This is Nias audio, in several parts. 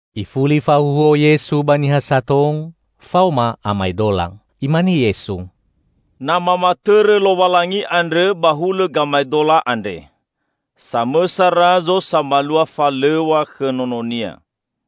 Ifuli fahuhuo Yesu ba niha sato faoma amaedola. Imane Yesu, "Na mamatõrõ Lowalangi andrõ ba hulõ gamaedola andre: Samõsa Razo samalua falõw̃a khõ nononia.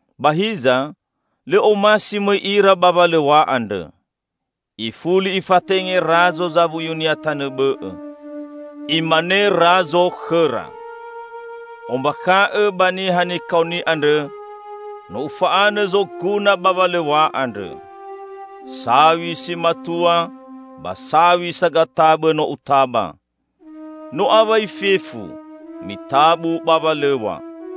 Ba hiza, lõ omasi mõi ira ba walõw̃a andrõ. Ifuli ifatenge Razo zawuyunia tanõ bõ'õ. Imane Razo khõra: Ombakha'õ ba niha nikaoni andrõ, 'No ufa'anõ zoguna ba walõw̃a andrõ. Saw̃i si matua ba saw̃i sagatabõ no utaba. No awai fefu, mitabu ba walõw̃a!'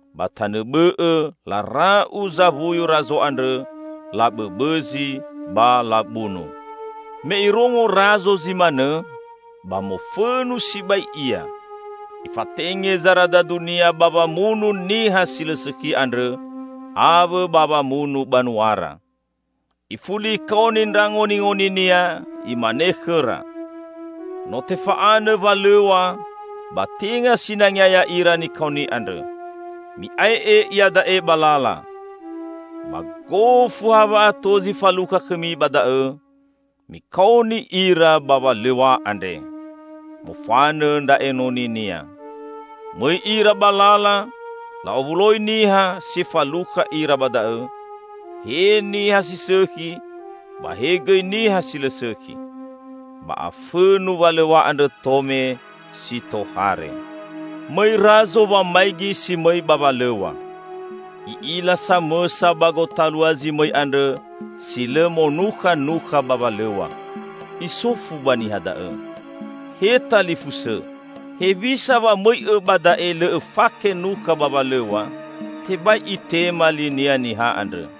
Ba tanõ bõ'õ lara'u zawuyu Razo andrõ, labõbõzi ba labunu. Me irongo Razo zi manõ, ba mofõnu sibai ia. Ifatenge zaradadunia ba wamunu niha si lõ sõkhi andrõ awõ ba wamunu banuara. Ifuli ikaoni ndra ngoningoninia, imane khõra, 'No tefa'anõ walõw̃a, ba tenga sinangea ya'ira nikaoni andrõ. Mi'ae'e iada'e ba lala. Ba gofu ha wa'ato zi falukha khõmi ba da'õ, mikaoni ira ba walõw̃a andre.' Mofanõ ndra enoninia. Mõi ira ba lala, la'owuloi niha, si falukha ira ba da'õ, he niha si sõkhi ba he gõi niha si lõ sõkhi. Ba afõnu walõw̃a andrõ tome, si tohare. Mõi Razo wamaigi si mõi ba walõw̃a. I'ila samõsa ba gotalua zi mõi andrõ zi lõ monukha nukha ba walõw̃a. Isofu ba niha da'õ, 'He talifusõ, hewisa wa mõi'õ ba da'e lõ õfake nukha ba walõw̃a?' Tebai itema linia niha andrõ.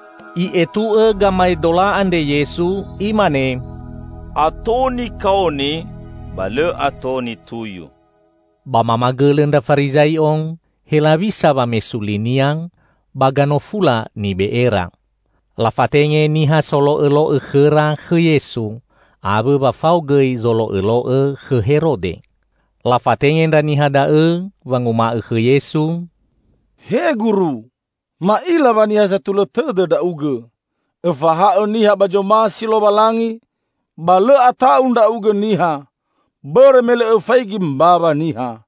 I'etu'õ gamaedola andre Yesu Imane, "Ato nikaoni, ba lõ ato nituyu." Ba mamagõlõ ndra Farizai'o, helawisa wamesu li-Nia ba ganofula nibe'era. Lafatenge niha solo'õlo'õ khõra khõ Yesu, awõ wa fao gõi zolo'õlo'õ khõ Herode. Lafatenge ndra niha da'õ wanguma'õ khõ Yesu, "He Guru, ma'ila wa niha satulõ tõdõ Ndra'ugõ. Õfahaõ niha ba zomasi Lowalangi, ba lõ ata'u Ndra'ugõ niha. Bõrõ me lõ Õfaigi mbawa niha.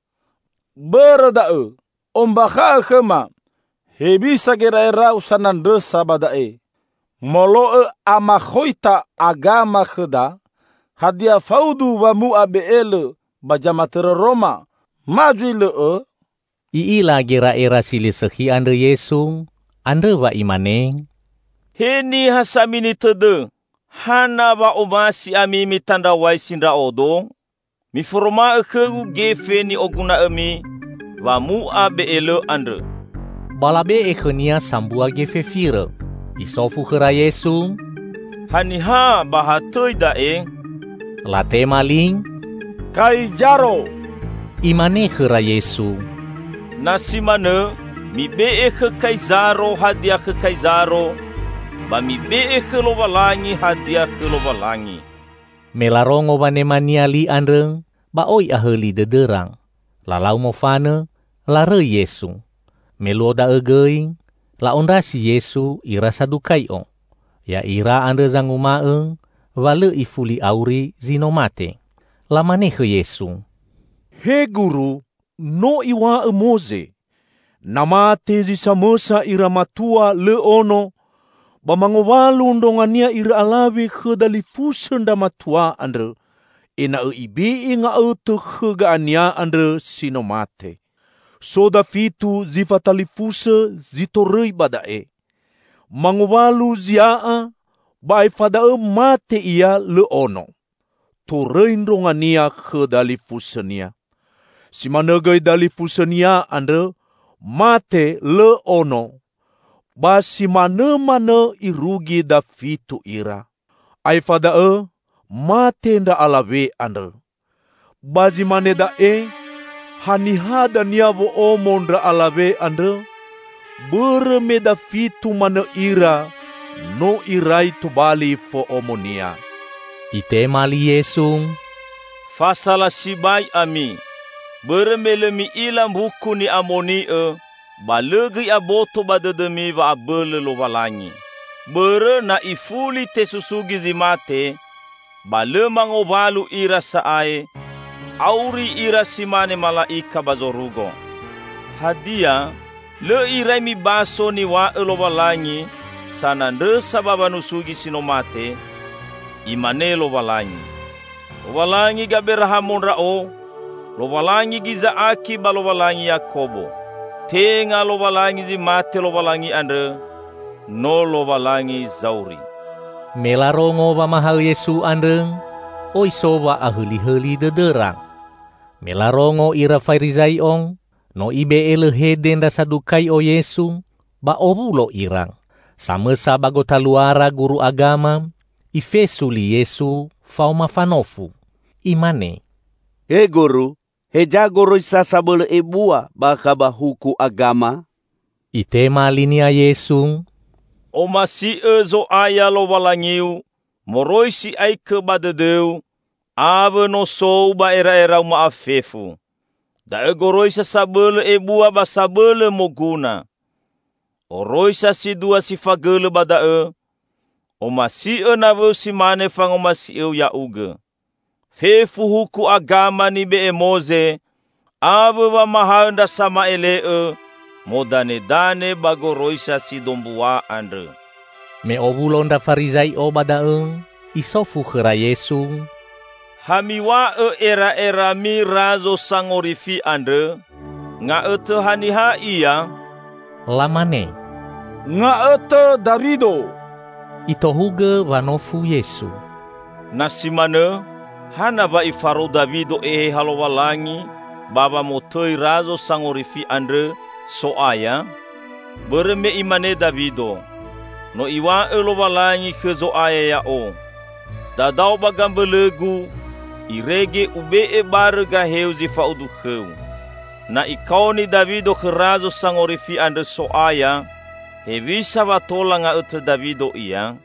Bõrõ da'õ, ombakha'õ khõma, hewisa gera'era-U sanandrõsa ba da'e: Molo'õ amakhoita agama khõda, hadia faudu wamu'a be'elõ ba zamatõrõ Roma ma zui lõ'õ?" I'ila gera'era si lõ sõkhi andrõ Yesu, andrõ wa Imane, "He niha samini tõdõ! Hana wa omasi ami mitandraw̃aisi Ndra'odo? Miforoma'õ khõ-Gu gefe ni'oguna'õmi wamu'a be'elõ andrõ!" Ba labe'e khõ-Nia sambua gefe firõ. Isofu khõra Yesu, "Haniha ba ha tõi da'e?" Latema li, "Kaizaro!" Imane khõra Yesu, "Na si manõ, mibe'e khõ Kaizaro hadia khõ Kaizaro ba mibe'e khõ Lowalangi hadia khõ Lowalangi!" Me larongo wanema-Nia li andrõ, ba oi ahõli dõdõra. Lalau mofanõ larõi Yesu. Me luo da'õ gõi la'ondrasi Yesu ira Sadukai'o. Ya'ira andrõ zanguma'õ wa lõ ifuli auri zi no mate. Lamane khõ Yesu, "He Guru," "no iw̃a'õ Moze: Na mate zi samõsa ira matua, lõ ono, ba mangowalu ndrongania ira alawe khõ dalifusõ ndra matua andrõ, ena'õ ibe'e nga'õtõ khõ ga'ania andrõ si no mate. So dafitu zi fatalifusõ si torõi ba da'e. Mangowalu zia'a ba aefa da'õ mate ia lõ ono. Torõi ndrongania khõ dalifusõnia. Si manõ gõi dalifusõnia andrõ, mate lõ ono. Ba simanõmanõ irugi dafitu ira. Aefa da'õ mate ndra alawe andrõ. Ba zi mane da'e, haniha dania wo'omo ndra alawe andrõ? Bõrõ me dafitu manõ ira no irai tobali fo'omonia." Itema li Yesu, "Fasala sibai ami, bõrõ me lõ mi'ila Mbuku Ni'amoni'õ, ba lõ gõi aboto ba dõdõmi wa'abõlõ Lowalangi. Bõrõ na ifuli tesusugi zi mate, ba lõ mangowalu ira sa'ae, auri ira si mane mala'ika ba zorugo. Hadia lõ irai mibaso niw̃a'õ Lowalangi sanandrõsa ba wanusugi si no mate? Imane Lowalangi, 'Lowalangi Gaberahamo ndra'o, Lowalangi Giza'aki ba Lowalangi Yakobo.' Tenga Lowalangi zi mate Lowalangi andrõ. No Lowalangi zauri!" Me larongo wamahaõ Yesu andrõ, oi so wa'ahõlihõli dõdõra. Me larongo ira Farizai'o no Ibe'e lõ hede ndra Sadukai'o Yesu, ba owulo ira. Samõsa ba gotaluara guru agama, ifesu li Yesu faoma fanofu. Imane, "He Guru, heza goroisa sabõlõ ebua bakha ba huku agama?" Itema linia Yesu, "Omasi'õ Zo'aya Lowalangiu, moroi si'aikõ ba dõdõu, awõ nosou ba era'erau ma'afefu. Da'õ goroisa sabõlõ ebua ba sabõlõ moguna! Oroisa si dua si fagõlõ ba da'õ: Omasi'õ nawõu si mane fangomasi'õu ya'ugõ. Fefu huku agama nibe'e Moze awõ wamahaõ ndra sama'ele'õ modanedane ba goroisa si dombua andrõ." Me owulo na ndra Farizai'o ba da'õ, Isofu khõra Yesu, "Hami'w̃a'õ era'erami Razo Sangorifi andrõ? Nga'õtõ haniha Ia?" Lamane, "Nga'õtõ Dawido!" Itohugõ wanofu Yesu, "Na si manõ, hana wa ifarou Dawido Eheha Lowalangi ba wamotõi Razo Sangorifi andrõ, 'So'aya'? Bõrõ me imane Dawido, 'No Iw̃a'õ Lowalangi khõ Zo'aya ya'o: Dadao ba gambõlõ-Gu, Irege Ube'e barõ gahe-U zi fa'udu khõ-U.' Na ikaoni Dawido khõ Razo Sangorifi andrõ 'So'aya', hewisa wa tola nga'õtõ Dawido Ia?"